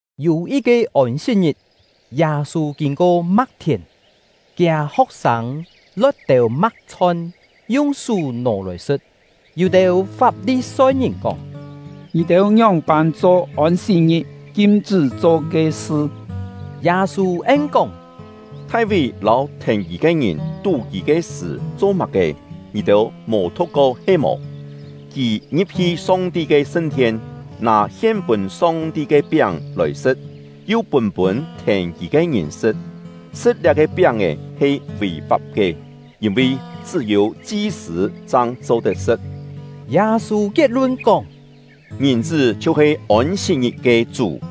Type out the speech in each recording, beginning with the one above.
Yû yit-ke Ôn-sit-ngit, Yâ-sû kîn-ko ma̍k-thièn; kiâ ho̍k-sâng lo̍t têu ma̍k-chhon, yung sú nò lòi sṳ̍t. Yû-têu Fap-li-soi-ngìn kóng: “Ngì-têu ngióng-pân cho Ôn-sit-ngit kim-chṳ́ cho ke sṳ?” Yâ-sû en-kóng: “Thai-ví lâu thèn kì ke ngìn tú-kî ke sṳ̀ cho má-ke, ngì-têu mò thu̍k-ko he-mò? Kì ngi̍p-hi Song-ti ke sṳn-thien, nâ hien-pûn Song-ti ke piáng lòi sṳ̍t, yu pûn-pûn thèn kì ke ngìn sṳ̍t; sṳ̍t liá-ke piáng-è he vì-fap ke, yîn-vi chṳ́-yû chi-sṳ̂ chang cho-tet sṳ̍t.” Yâ-sû kiet-lun kóng: “Ngìn-chṳ́ chhiu-he Ôn-sit-ngit ke Chú.”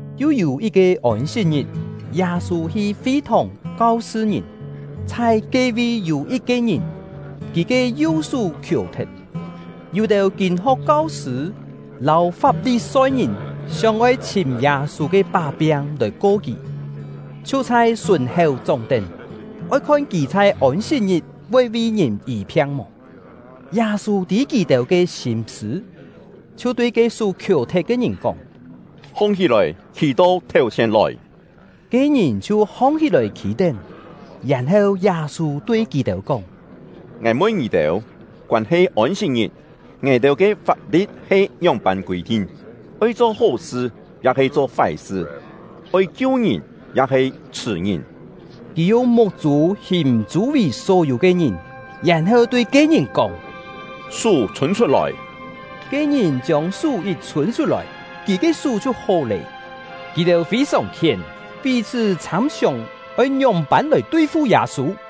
Yu yû yit-ke Ôn-sit-ngit, Yâ-sû hi fi-thòng kau-sṳ ngìn; chhai ke-vi yû yit-ke ngìn, kì ke yu-sú khiò-thet. Yû-têu kîn-ho̍k kau-sṳ̂ lâu Fap-li-soi-ngìn sióng-oi chhìm Yâ-sû ke pá-piang lòi ko kì, chhiu chhai sùn-héu chóng-tén, oi khon kì chhai Ôn-sit-ngit voi vi ngìn yî-phiang mò. Yâ-sû tî kì-têu ke sîm-sṳ̂, chhiu tui ke sú khiò-thet ke ngìn kóng: “Hong-hí-lòi, khî-to thèu-chhièn lòi!” Ke-ngìn chhiu hong-hí-lòi khî-tén. Yèn-heu, Yâ-sû tui kì-têu kóng: “Ngài mun ngì-têu, koân-he Ôn-sit-ngit, ngài-têu ke fap-li̍t he ngióng-pân kûi-thin? Oi cho hó-sṳ, ya-he cho fái-sṳ? Oi kiu ngìn, ya-he chhṳ̀ ngìn?” Kì yung muk-chû hìm chû-vì só-yû ke ngìn, yèn-heu tui ke-ngìn, kóng: “Sú chhûn chhut-lòi!” Ke-ngìn chiông sú yit chhûn chhut-lòi, kì ke sú chhiu hó lé. Kì-têu fî-sòng khién, pí-chhṳ́ chhâm-siòng oi ngióng-pân lòi tui-fu Yâ-sû.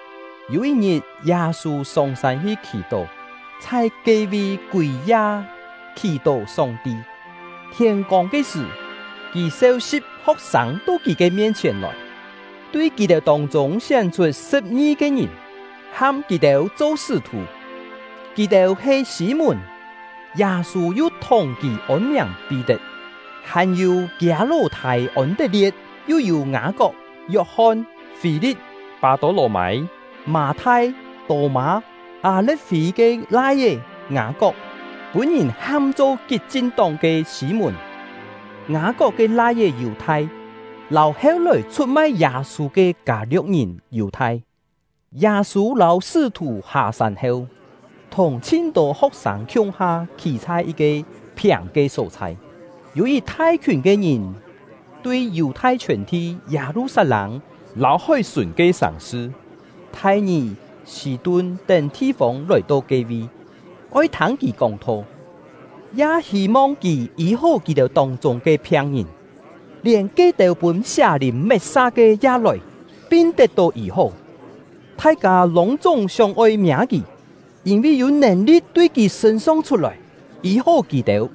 Yû yit-ngit, Yâ-sû sông-sân hi khì-tó, chhai ke-vi kûi-ya khì-tó Song-ti. Thiên-kông ke sṳ̀, kì seu-si̍p ho̍k-sâng to kì ke mien-chhièn lòi, tui kì-têu tông-chûng sién-chhut sṳ̍p-ngi-ke ngìn, ham kì-têu cho sṳ́-thù. Kì-têu he: Sî-mùn (Yâ-sû yu thùng kì ôn-miàng Pí-tet) hàn-yû kiâ ló-thâi Ôn-tet-lie̍t, yu yû Ngâ-kok, Yok-hon, Fî-li̍t, Pâ-tô-lò-mâi, Mâ-thai, Tô-mâ, Â-le̍t-fî ke lai-é Ngâ-kok, pûn-ngìn ham-cho Kit-chin-tóng ke Sî-mùn, Ngâ-kok ke lai-é Yù-thai, lâu heu-lòi chhut-mai Yâ-sû ke Kâ-lio̍k-ngìn Yù-thai. Yâ-sû lâu sṳ́-thù hâ-sân heu, thùng chhin tô ho̍k-sâng khiung-ha khî chhai yit-ke phiàng ke só-chhai. Yû yit thai-khiùn ke ngìn tui Yù-thai chhiòn-thi, Yâ-lu-sat-lâng lâu hói-sùn ke sàng-sṳ Thai-ngì, Sî-tun tén thi-fông lòi-to ke-vi, oi thâng kì kóng-tho, ya hî-mong kì yî-hó kì-têu tông-chûng ke phiang-ngìn; lièn ke-têu pûn sià-lìn met-sa ke ya lòi, pin tet-tó yî-hó. Thai-kâ lûng-chúng sióng-oi miâ kì, yîn-vi yû nèn-li̍t tui kì sṳ̂n-song chhut-lòi, yî-hó kì-têu.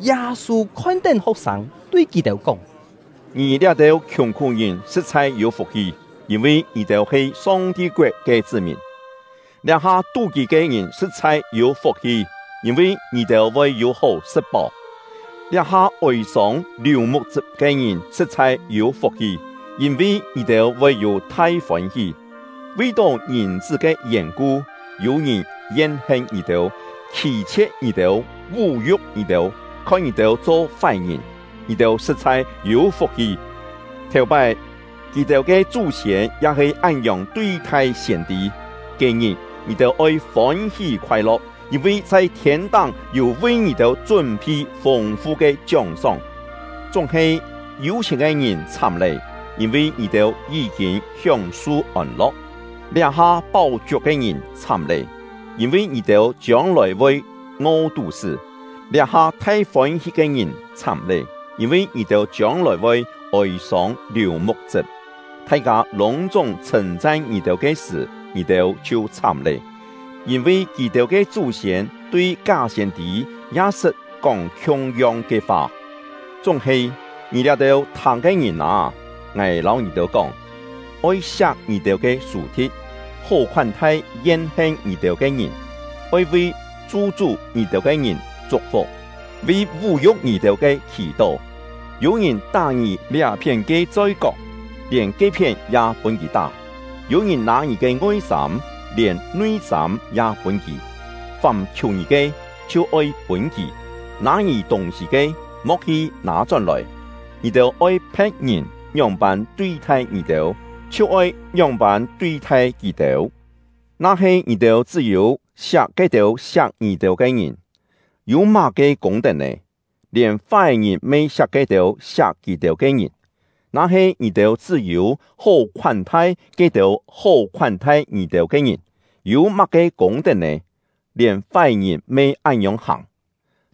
Yâ-sû khon-tén ho̍k-sâng, tui kì-têu kóng: “Ngì liá-têu khiùng-khú-ngìn sṳ̍t-chhai yû fuk-hi, yîn-vi ngì-têu he Song-ti koet ke chṳ́-mìn! “Liá-ha tú-kî ke ngìn sṳ̍t-chhai yû fuk-hi, yîn-vi ngì-têu voi yû hó sṳ̍t-páu! “Liá-ha ôi-sông liù muk-chṳp ke ngìn sṳ̍t-chhai yû fuk-hi, yîn-vi ngì-têu voi yû thai fôn-hí! “Vi-tó Ngìn-chṳ́ ke yèn-ku, yû-ngìn yen-hen ngì-têu, khî-chhie̍t ngì-têu, vú-yu̍k ngì-têu, khon ngì-têu cho fái-ngìn, ngì-têu sṳ̍t-chhai yû fuk-hi! Thèu-pái, kì-têu ke chú-siên ya he án-ngiòng tui-thai siên-tî. Ke-ngit, ngì-têu oi fôn-hí khoai-lo̍k, yîn-vi chhai thiên-táng yû vi ngì-têu chún-phi fûng-fu ke chióng-sóng. “Chúng-he, yû-chhièn ke ngìn chhám lé! Yîn-vi ngì-têu yí-kîn hióng-su ôn-lo̍k! “Liá-ha páu-chiuk ke ngìn chhám lé! Yîn-vi ngì-têu chiông-lòi voi ngo-tú-sṳ́! “Liá-ha thai fôn-hí ke ngìn chhám lé! Yîn-vi ngì-têu chiông-lòi voi ôi-sông liù muk-chṳp! “Thai-kâ lûng-chúng chhṳ̂n-chan ngì-têu ke sṳ̀, ngì-têu chhiu chhám lé! Yîn-vi kì-têu ke chú-siên tui ká siên-tî ya sṳt kóng khiung-yong ke fa. “Chúng-he, ngì liá-têu thâng ke ngìn â, ngài lâu ngì-têu kóng: Oi siak ngì-têu ke sù-thi̍t, hó khoán-thai yen-hen ngì-têu ke ngìn; oi vi chu-chú ngì-têu ke ngìn chuk-fuk, vi vú-yu̍k ngì-têu ke khì-tó. Yû-ngìn tá ngì liá-phién ke choi-kok, lièn ke-phién ya pûn kì tá! Yû-ngìn nâ ngì ke ngoi-sâm, lièn nui-sâm ya pûn kì! Fàm khiù ngì ke, chhiu oi pûn kì; nâ ngì tûng-sî ke, mo̍k hi nâ-chón-lòi. Ngì-têu oi phe̍t-ngìn ngióng-pân tui-thai ngì-têu, chhiu oi ngióng-pân tui-thai kì-têu. “Na-he ngì-têu chṳ́-yû siak ke-têu siak ngì-têu ke ngìn, yû má-ke kûng-tet nè? Lièn fái-ngìn me siak ke-têu siak kì-têu ke ngìn! Na-he ngì-têu chṳ́-yû hó khoán-thai ke-têu hó khoán-thai ngì-têu ke ngìn, yû má-ke kûng-tet nè? Lièn fái-ngìn me án-ngiòng hàng!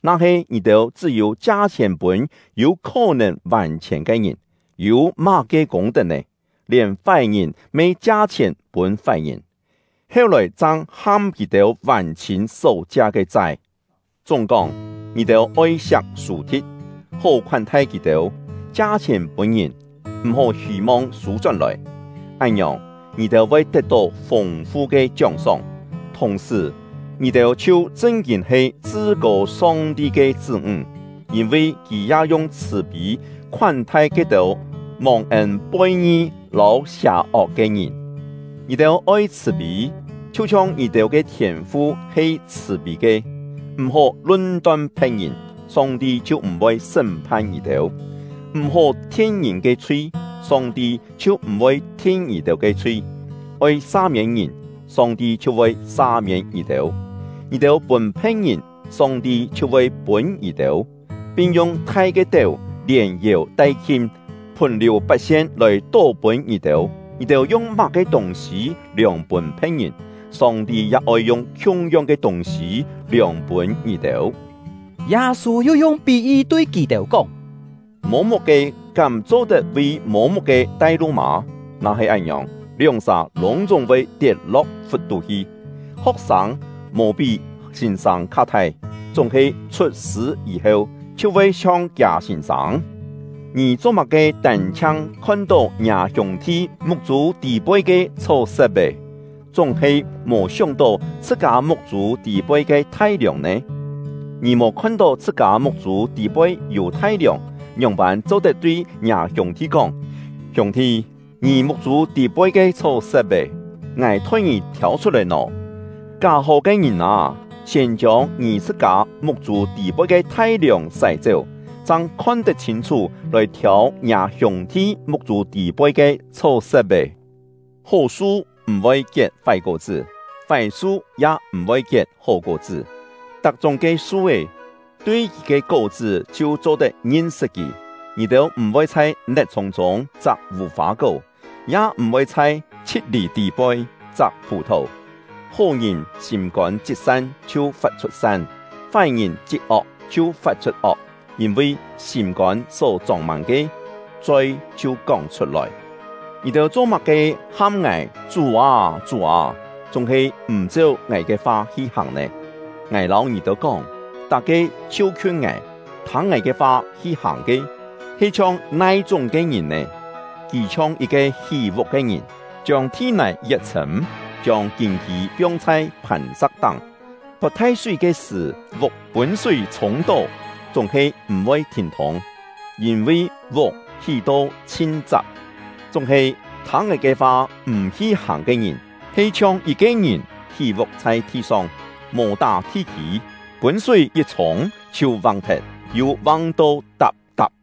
Na-he ngì-têu chṳ́-yû chia-chhièn pûn yû khó-nèn vàn-chhièn ke ngìn, yû má-ke kûng-tet nè? Lièn fái-ngìn me chia-chhièn pûn fái-ngìn, heu-lòi chang ham kì-têu vàn-chhîn só chia ke chai! Chúng-kóng, ngì-têu oi siak sù-thi̍t, hó khoán-thai kì-têu; chia-chhièn pûn ngìn, m̀-hó hî-mong sû-chón-lòi. Án-ngiòng, ngì-têu voi tet-tó fûng-fu ke chióng-sóng, thùng-sṳ̀, ngì-têu chhiu chṳn-kîn he Chṳ-kô Song-ti ke chṳ́-ńg, yîn-vi Kì ya yung chhṳ̀-pî khoán-thai ke-têu mòng-ên poi-ngi lâu sià-ok ke ngìn. Ngì-têu oi chhṳ̀-pî, chhiu-chhiong ngì-têu ke Thiên-fu he chhṳ̀-pî ke. “M̀-hó lun-ton phe̍t-ngìn, Song-ti chhiu m̀-voi sṳ́m-phan ngì-têu; m̀-hó thin ngìn ke chhui, Song-ti chhiu m̀-voi thin ngì-têu ke chhui; oi sa-miên ngìn, Song-ti chhiu voi sa-miên ngì-têu. Ngì-têu pûn phe̍t-ngìn, Song-ti chhiu voi pûn ngì-têu, pin yung thai ke téu, lièn-yèu-tai-khim, phùn-liù pat-sien lòi tó pûn ngì-têu. Ngì-têu yung má-ke tûng-sî liòng pûn phe̍t-ngìn, Song-ti ya oi yung khiung-yong ke tûng-sî liòng pûn ngì-têu.” Yâ-sû yu yung pí-yi tui kì-têu kóng: “Mô-muk-ke kám cho-tet vi mô-muk-ke tai-lu mâ? Na-he án-ngiòng, lióng-sà lûng-chúng voi tiet-lo̍k fut-tú hi. Ho̍k-sâng mò pí sîn-sâng kha thai, chúng-he chhut-sṳ̂ yî-heu, chhiu voi chhiong kiâ sîn-sâng. “Ngì cho-má-ke tân-chhiang khon-tó ngiâ hiûng-thi muk-chû tî-poi ke chhó-sep-é, chúng-he mò sióng-tó chhṳ-kâ muk-chû tî-poi ke thai-liòng nè? Ngì mò khon-tó chhṳ-kâ muk-chû tî-poi yû thai-liòng, ngióng-pân cho-tet tui ngiâ hiûng-thi kóng: ‘Hiûng-thi, ngì muk-chû tî-poi ke chhó-sep-é, ngài thoi ngì thiâu chhut-lòi’ nò? Ká-hó ke ngìn â, siên chiông ngì chhṳ-kâ muk-chû tî-poi ke thai-liòng sái-chéu, chang khon-tet chhîn-chhú lòi thiâu ngiâ hiûng-thi muk-chû tî-poi ke chhó-sep-é. “Hó su m̀-voi kiet fái kó-chṳ́, fái su ya m̀-voi kiet hó kó-chṳ́. Tak-chúng ke su-é, tui kì ke kó-chṳ́ chhiu cho-tet ngin-sṳt kì. Ngì-têu m̀-voi chhai net-chhùng-chûng chak vù-fâ-kó, ya m̀-voi chhai chhi̍t-lì tî-poi chak phù-thò. Hó-ngìn sîm-kôn chit san chhiu fat-chhut san; fái-ngìn chit ok chhiu fat-chhut ok. Yîn-vi sîm-kôn só chông-mân ke, choi chhiu kóng chhut-lòi. “Ngì-têu cho-má-ke ham ngài ‘Chú â, Chú â’, chúng-he m̀ cheu ngài ke fa hi hàng nè? Ngài lâu ngì-têu kóng, tak-ke chhiu-khiun ngài, thâng ngài ke fa hi-hàng ke, he chhiong nai-chúng ke ngìn nè? Kì chhiong yit-ke hí-vuk ke ngìn, chiông thi-nài yet chhṳ̂m, chiông kîn-kî piong chhai phàn-sa̍k-táng. Pot thai-súi ke sṳ̀, vuk pûn súi chhûng-tó, chúng-he m̀-voi thîn-thûng, yîn-vi vuk hí-to chhin chap. Chúng-he, thâng ngài ke fa m̀ hi-hàng ke ngìn, he chhiong yit-ke ngìn hí-vuk chhai thi-song, mò tá thi-kî, pûn súi yit chhûng, chhiu vang-thet, yu vang-to tap-tap!”